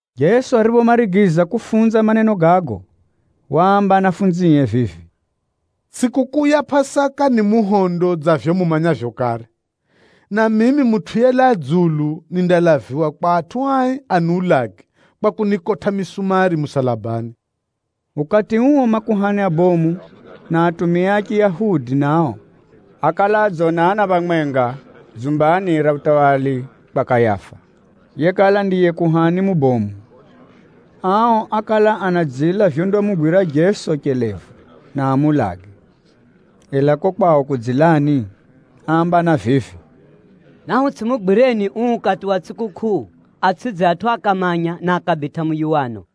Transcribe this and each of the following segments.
Jeso ariphomarigiza kufunza maneno gago, waamba ahumwae vivi, “Tsʼikukʼuu ya Pʼasaka ni muhondo dza vivyo mumanyavyo kare, na mimi Mutʼu yelaa dzulu nindalaviwa kwa atʼu ai aniulage kwa kunikotʼa misumari musalabani.” Ukati uo, makuhani abomu na atumia a Chiyahudi nao, ákala adzonana phamwenga dzumbani ra utawala kwa Kayafa, yekala ndiye kuhani mubomu. Ao ákala anadzila vyondamugwira Jeso chelevu, na amuulage. Ela kuko kwao kudzilani áambana vivi, “Nahutsʼimugwireni uu ukati wa tsʼikukʼuu, atsʼidze atʼu akamanya, na akabitʼa muyuwano.”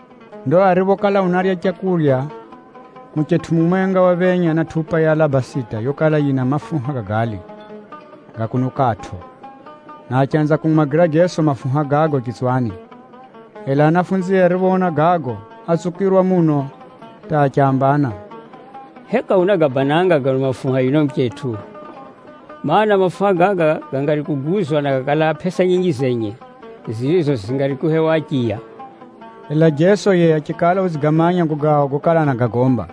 Ndo ariphokala unarya leu, muchetʼu mumwenga waphenya na tʼupa ya alabasita yokala yina mafuha ga gali, ga kunukʼatʼo, na achanza kumumwagira Jeso mafuha gago chitswani. 8Ela ahumwae ariphoona gago, átsukirwa muno hata achambana, “Heka unagabananga gano mafuha yuno muchetʼu? Maana, mafuha gaga gangari kuguzwa na gakalaa pʼesa nyinji zenye, zirizo zingari kuhewa achiya.” Ela Jeso yiye achikala udzigamanya gago gao gokala anagagomba,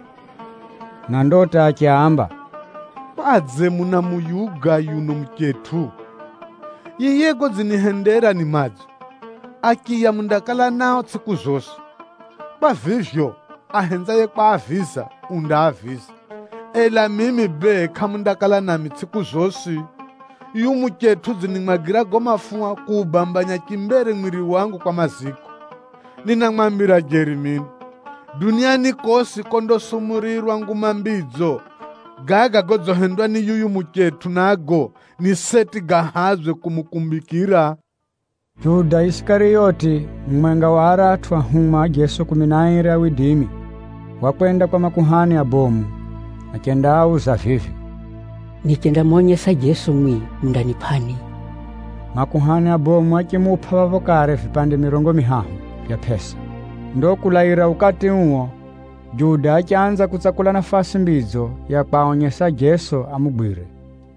na ndo hata achiaamba, “Kwadze munamuyuga yuno muchetʼu? Yiye godzinihendera ni madzo. Achiya mundakala nao tsʼiku zosi. Kwa vivyo, ahenzaye kwaaviza, undaaviza, ela mimi bee kʼamundakala nami tsʼiku zosi. Yuyu muchetʼu udzinimwagira gago mafuha kuubambanya chimbere mwiri wangu kwa maziko. Ninamwambira jeri mino, duniani kosi kondasumurirwa Nguma Mbidzo, gaga godzihendwa ni yuyu muchetʼu nago ni seti gahadzwe kumukumbikira.” Juda Isikariyoti, mumwenga wa aratʼu ahumwa a Jeso kumi na airi, wakwenda kwa makuhani abomu achendaauza vivi, “Nichendamonyesa Jeso mwimwi, mundanipʼani?” Makuhani abomu achimupʼa phapho kare vipande mirongo mihahu vya pʼesa. Ndo kulaira ukati uo, Juda achanza kutsakula nafasi mbidzo ya kwaonyesa Jeso amugwire.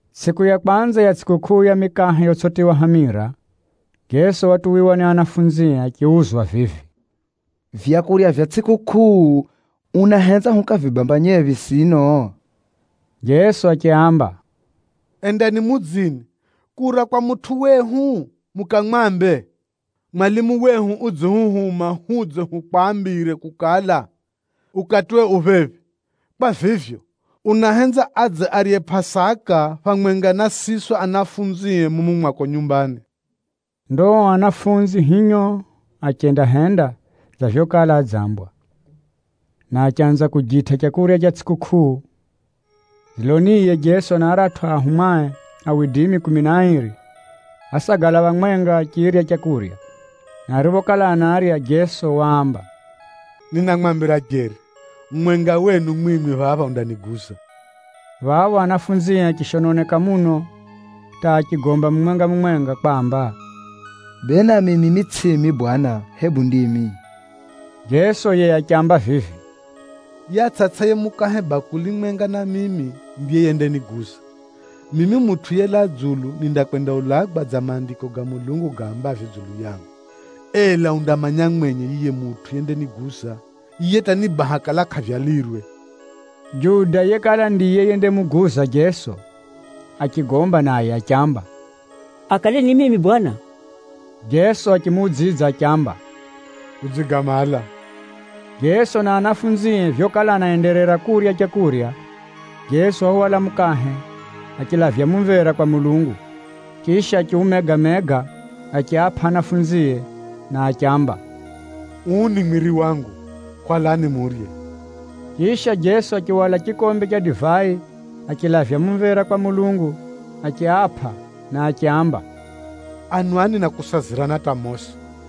Tsʼiku ya kwanza ya tsʼikukʼuu ya mikahe yotsʼitiywa hamira, Jeso watuwiwa ni ahumwae achiuzwa vivi, “Vyakurya vya tsʼikukʼuu, unahenza hukavibambanyephi sino?” Jeso achiaamba, “Endani mudzini, kura kwa mutʼu wehu mukamwambe, ‘Mwalimu wehu udzihuhuma hudze hukwambire kukala, ukatiwe ufika phephi. Kwa vivyo, unahenza adze arye Pʼasaka phamwenga na siswi ahumwae mumu mwako nyumbani.’” Ndo ao ahumwa hinyo achendahenda dza vyokala adzambwa, na achanza kujitʼa leu ra tsʼikukʼuu. Dziloniye, Jeso na aratʼu ahumwae kumi na airi, ásagala phamwenga achirya leu. Na ariphokala anarya, Jeso waamba, “Ninamwambira jeri, mumwenga wenu mwimwi phapha undaniguza.” Phapho ahumwae achishononeka muno, hata achigomba mumwenga-mumwenga kwamba, “Bee nami mimi tsʼimi Bwana, hebu ndimi?” Jeso yiye achiamba vivi, “Yiye atsʼatsʼaye mukahe bakuli mwenga na mimi ndiye yendaniguza. Mimi Mutʼu yelaa dzulu nindakwendaulagwa dza Maandiko ga Mulungu gaambavyo dzulu yangu, ela undamanya mwenye yiye mutʼu yendaniguza! Yiye hata ni baha kala kʼavyalirwe!” Juda yekala ndiye yendamuguza Jeso achigomba naye achiamba, “Akale ni mimi Bwana?” Jeso achimuudzidza achiamba, “Udzigamala.” Jeso na ahumwae vyokala anaenderera kurya leu, Jeso wahwala mukahe achilavya mumvera kwa Mulungu, chisha achiumega-mega achiapʼa ahumwae na achiamba, “Uu ni mwiri wangu, hwalani murye.” Chisha, Jeso achihwala chikombe cha divai, achilavya mumvera kwa Mulungu achiapʼa na achiaamba, “Anwani na kusazirana hata mosi.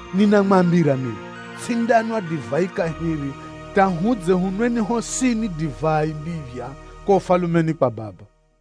Ninamwambira mino, tsʼindanwa divai kahiri hata hudze hunweni hosini divai mbiphya kuko Ufalumeni kwa Baba.”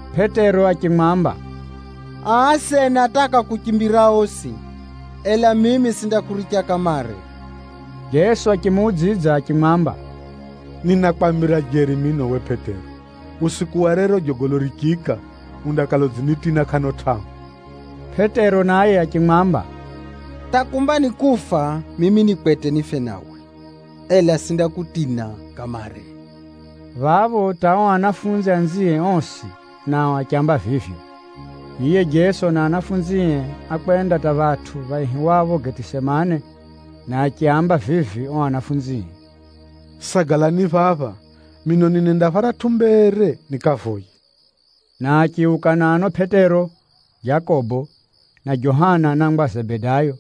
Pʼetero achimwamba, “Aa asena hata akakuchimbira osi, ela mimi tsʼindakuricha kamare!” Jeso achimuudzidza achimwamba, “Ninakwambira jeri mino uwe Pʼetero, usiku wa rero jogolo richiika, undakala udzinitina kʼano tʼahu.” Pʼetero naye achimwamba, “Hata kumba ni kufa mimi ni kwete nife nawe, ela tsʼindakutina kamare!” Phapho hata ao ahumwa anzie osi nao achiamba vivyo. Yiye Jeso na ahumwae ákwenda hata phatʼu phaihiwapho Getisemane, na achiaamba vivi ao ahumwae, “Sagalani phapha mino ninenda pharatʼu mbere nikavoye.” Na achiuka na ano Pʼetero, Jakobo na Johana anangwa a Zebedayo,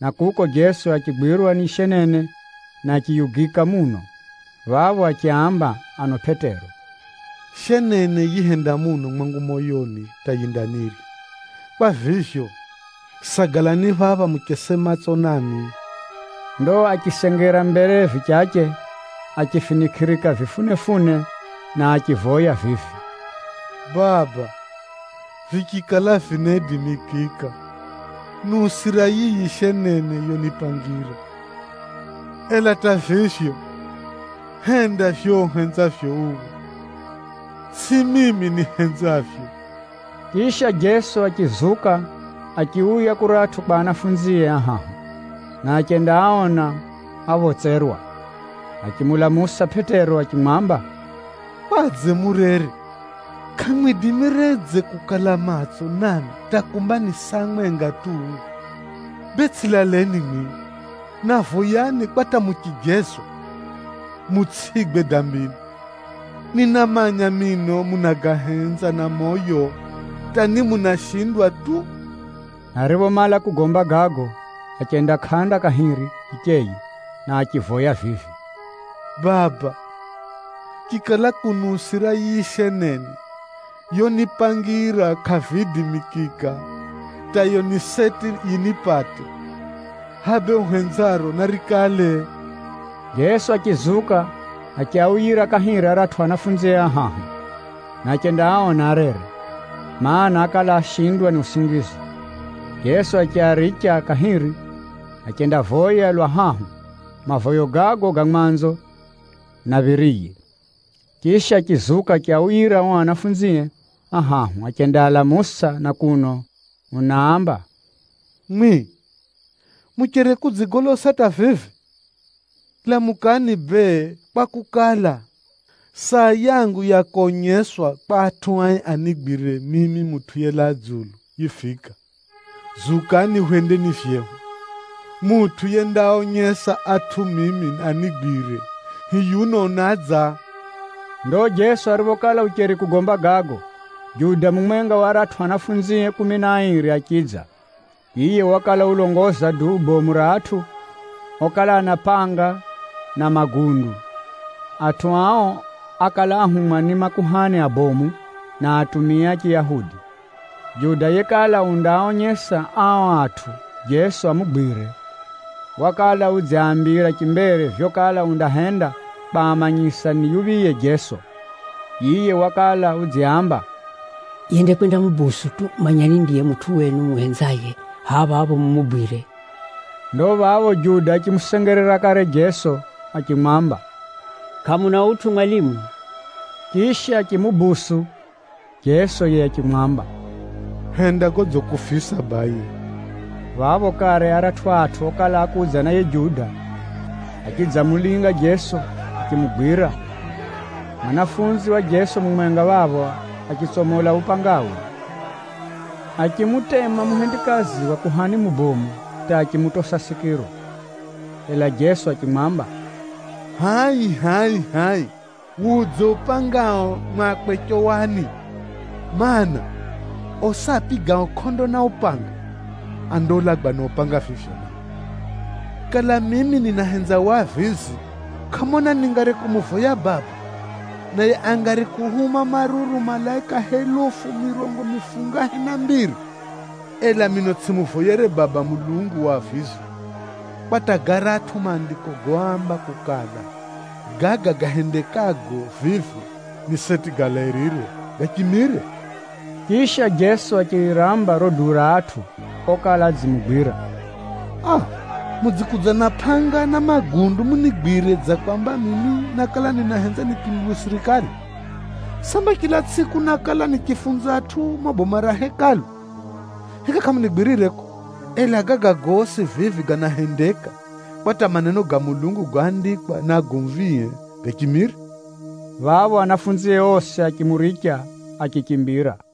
na kuko Jeso achigwirwa ni shenene na achiyugika muno. Phapho achiaamba ano Pʼetero, “Shenene yihenda muno mwangu moyoni hata yindanirya. Kwa vivyo, sagalani phapha muchese matso na mino.” Ndo achisengera mbere vichache achifinikʼirika vifunefune, na achivoya vivi, “Baba, vichikala vinaidimikika, niusira yiyi shenene yonipangira. Ela hata vivyo, henda vivyo uhenzavyo uwe, tsʼihivyo mimi nihenzavyo.” Chisha, Jeso achizuka achiuya kuratʼu kwa ahumwae ahahu, na achendaaona aphotserwa. Achimulamusa Pʼetero achimwamba, “Kwadze murere? Kʼamwidimiredze kukala matso nami hata kumba ni saa mwenga tu? Bee tsʼilaleni mwimwi, na voyani kwa hata muchijezwa, mutsʼigwe dambini. Ninamanya mino munagahenza na moyo, hata ni munashindwa tu.” Ariphomala kugomba gago, achenda kʼanda kahiri hicheye na achivoya vivi, “Baba, chikala kuniusira yiyi shenene yonipangira kʼaviidimikika hata yiyo ni seti yinipate, hʼaya bee uhenzaro narikale.” Jeso achizuka achiauyira kahiri aratʼu ahumwae ahahu, na achendaaona arere, mana, ákala ashindwa ni usingizi. Jeso achiaricha kahiri achendavoya lwa hahu mavoyo gago ga mwanzo na phiriye. Chisha, achizuka achiauyira ao ahumwae ahahu achendaalamusa na kuno unaamba, “Mwimwi mucheri kudzigolosa hata vivi? Lamukani bee kwakukala, saa yangu ya konyeswa kwa adambi anigwire mimi Mutʼu yelaa dzulu, yifika. Zukani hwendeni vyehu. Mutʼu yendaaonyesa atʼu mimi anigwire, hiyuno unadza.” Ndo Jeso ariphokala ucheri kugomba gago, Juda mumwenga wa aratʼu ahumwae kumi na airi achidza. Yiye wakala ulongoza duu bomu ra atʼu okala ana pʼanga na magundu. Atʼu ao ákala áhumwa ni makuhani abomu, na atumia a Chiyahudi. Juda yekala undaaonyesa ao atʼu Jeso amugwire, wakala udziaambira chimbere vyokala undahenda kwamanyisa ni yuphiye Jeso. Yiye wakala udziaamba, “Yendakwendamudonera tu, manyani ndiye mutʼu wenu mumuhenzaye, hʼaya phapho mumugwire.” Ndo phapho Juda achimusengerera kare Jeso achimwamba, “Kʼamuna utʼu, mwalimu?” Chisha achimudonera. Jeso yiye achimwamba, “Henda godzikufisa baye.” Phapho kare aratʼu atʼu okala ákudza na yiye Juda, achidzamulinga Jeso achimugwira. Muhumwa wa Jeso mumwenga phapho achitsomola upangawe achimutema muhendikazi wa kuhani mubomu hata achimutosa sikiro. Ela Jeso achimwamba, “Hʼai, hʼai, hʼai! Wudze upangao mwakwe chowani, mana, osi apigao kʼondo na upanga, andaulagwa na upanga vivyo nao. Kala mimi ninahenza wavizi, kʼamona ningari kumuvoya Baba, naye angari kuhuma maruru malaika helufu mirongo mifungahe na mbiri! Ela mino tsʼimuvoyere Baba Mulungu wavizi, kwa hata garatʼu Maandiko goamba kukala, gaga gahendekago vivi ni seti galairire, gachimire.” Chisha, Jeso achiramba riro duu ra atʼu okala adzimugwira, “Aa! Mudzikudza na pʼanga na magundu munigwire dza kwamba mimi nákala ninahenza nipinduwe sirikali? Samba chila tsʼiku nákala nichifunza atʼu mumo boma ra Hekalu? Heka kʼamunigwirire kuko? Ela gaga gosi vivi ganahendeka, kwa hata maneno ga Mulungu goandikwa ni agomvie gachimire.” Phapho ahumwae osi achimuricha achichimbira.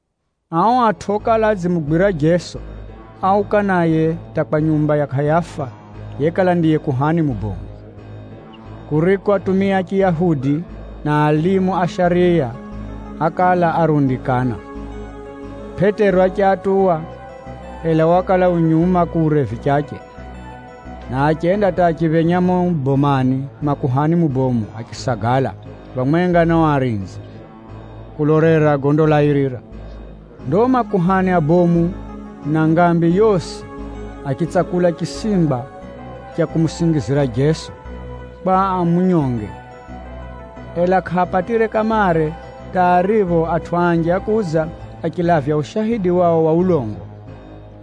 Ao atʼu okala adzimugwira Jeso, áuka naye hata kwa nyumba ya Kayafa yekala ndiye kuhani mubomu, kuriko atumia a Chiyahudi na alimu a shariya ákala arundikana. Pʼetero achiatuwa, ela wakala u nyuma kure vichache. Na achenda hata achiphenya mumo bomani mwa kuhani mubomu achisagala phamwenga na ao arinzi, kulolera gondalairira. Ndo makuhani abomu na ngambi yosi achitsakula chisingwa cha kumusingizira Jeso, kwa amunyonge. Ela kʼaapatire kamare hata aripho atʼu anji ákudza achilavya ushaidi wao wa ulongo.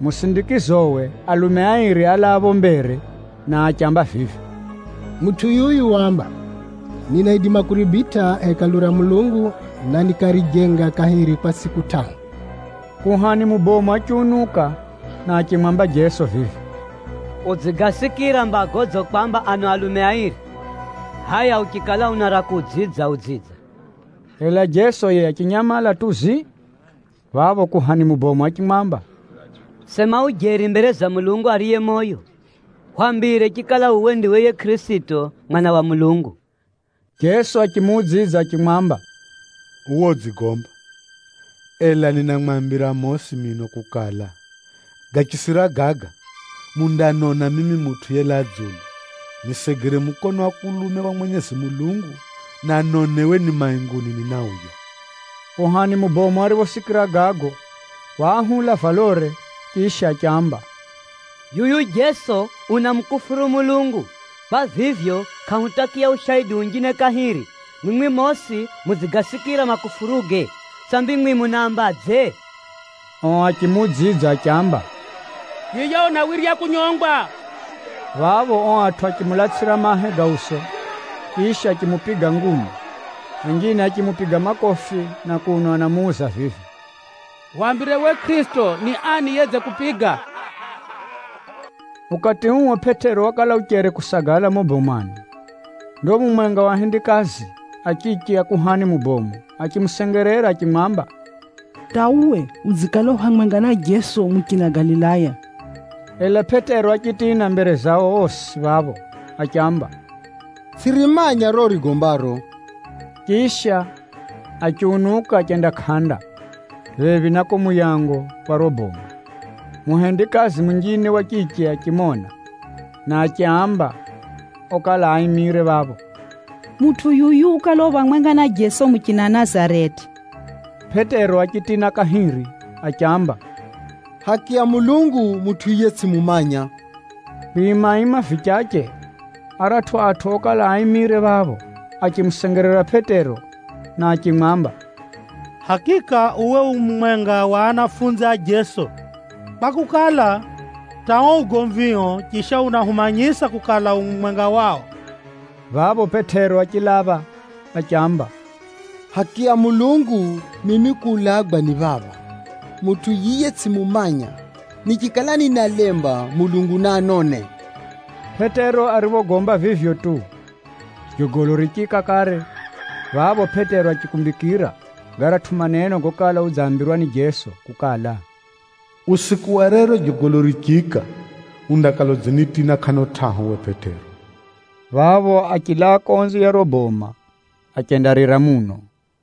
Musindikizowe, alume airi álaa phapho mbere na achiamba vivi, “Mutʼu yuyu waamba, ‘Ninaidima kuribitʼa Hekalu ra Mulungu, na nikarijenga kahiri kwa tsʼiku tʼahu.’” Kuhani mubomu achiunuka na achimwamba Jeso vivi, “Udzigasikira mba godzikwamba ano alume airi? Hʼaya uchikala una ra kuudzidza, udzidza.” Ela Jeso yiye achinyamala tu zii. Phapho kuhani mubomu achimwamba, “Sema ujeri mbere za Mulungu ariye moyo! Hwambire chikala uwe ndiwe yiye Kʼirisito, Mwana wa Mulungu!” Jeso achimuudzidza achimwamba, “Uwe udzigomba. Ela ninamwambira mosi mino kukala, gachisira gaga mundanona mimi Mutʼu yelaa dzulu na nisegere mukono wa kulume wa Mwenyezi Mulungu na ni mainguni ninadza.” Kuhani mubomu ariphosikira gago, waahula valore, chisha achiamba, “Yuyu Jeso unamukufuru Mulungu! Kwa vivyo kʼahutakiya ushaidi unjine kahiri! Mwimwi mosi mudzigasikira makufuruge. Sambi mwimwi munaambadze?” Ao achimuudzidza achiamba, “Yiye unawirya kunyongwa!” Phapho ao atʼu achimulatsʼira mahe ga uso, chisha achimupiga ngumi. Anjine achimupiga makofi na kuno anamuuza vivi, “Hwambire we Kʼirisito, ni ani yedzikupiga?” Ukati uo, Pʼetero wakala ucheri kusagala mumo bomani. Ndo mumwenga wa ahendikazi a chiche a kuhani mubomu achimusengerera achimwamba, “Hata uwe udzikala u phamwenga na Jeso muchina Galilaya!” Ela Pʼetero achitina mbere zao osi phapho achiamba, “Tsʼirimanya riro urigombaro!” Chisha, achiunuka achenda kʼanda, phephi na kuko muyango wa riro boma. Muhendikazi munjine wa chiche achimona, na achiaamba okala aimire phapho, “Mutʼu yuyu ukala u phamwenga na Jeso muchina Nazareti.” Pʼetero achitina kahiri achiamba, “Haki ya Mulungu, mutʼu yiye tsʼimumanya.” Kwimaima vichache, aratʼu atʼu okala aimire phapho achimusengerera Pʼetero na achimwamba, “Hakika uwe u mumwenga wa a Jeso, kwakukala, hata uo ugomvio chisha unahumanyisa kukala, u mumwenga wao.” Phapho Pʼetero achilapha achiamba, “Haki ya Mulungu mimi kuulagwa ni phapha, mutʼu yiye tsʼimumanya! Nichikala ninalemba, Mulungu naanone!” Pʼetero ariphogomba vivyo tu, jogolo richiika kare. Phapho Pʼetero achikumbikira garatʼu maneno gokala udzambirwa ni Jeso kukala, “Usiku wa rero jogolo richiika, undakala udzinitina kʼano tʼahu uwe Pʼetero,” phapho achilaa konze ya riro boma, achendarira muno.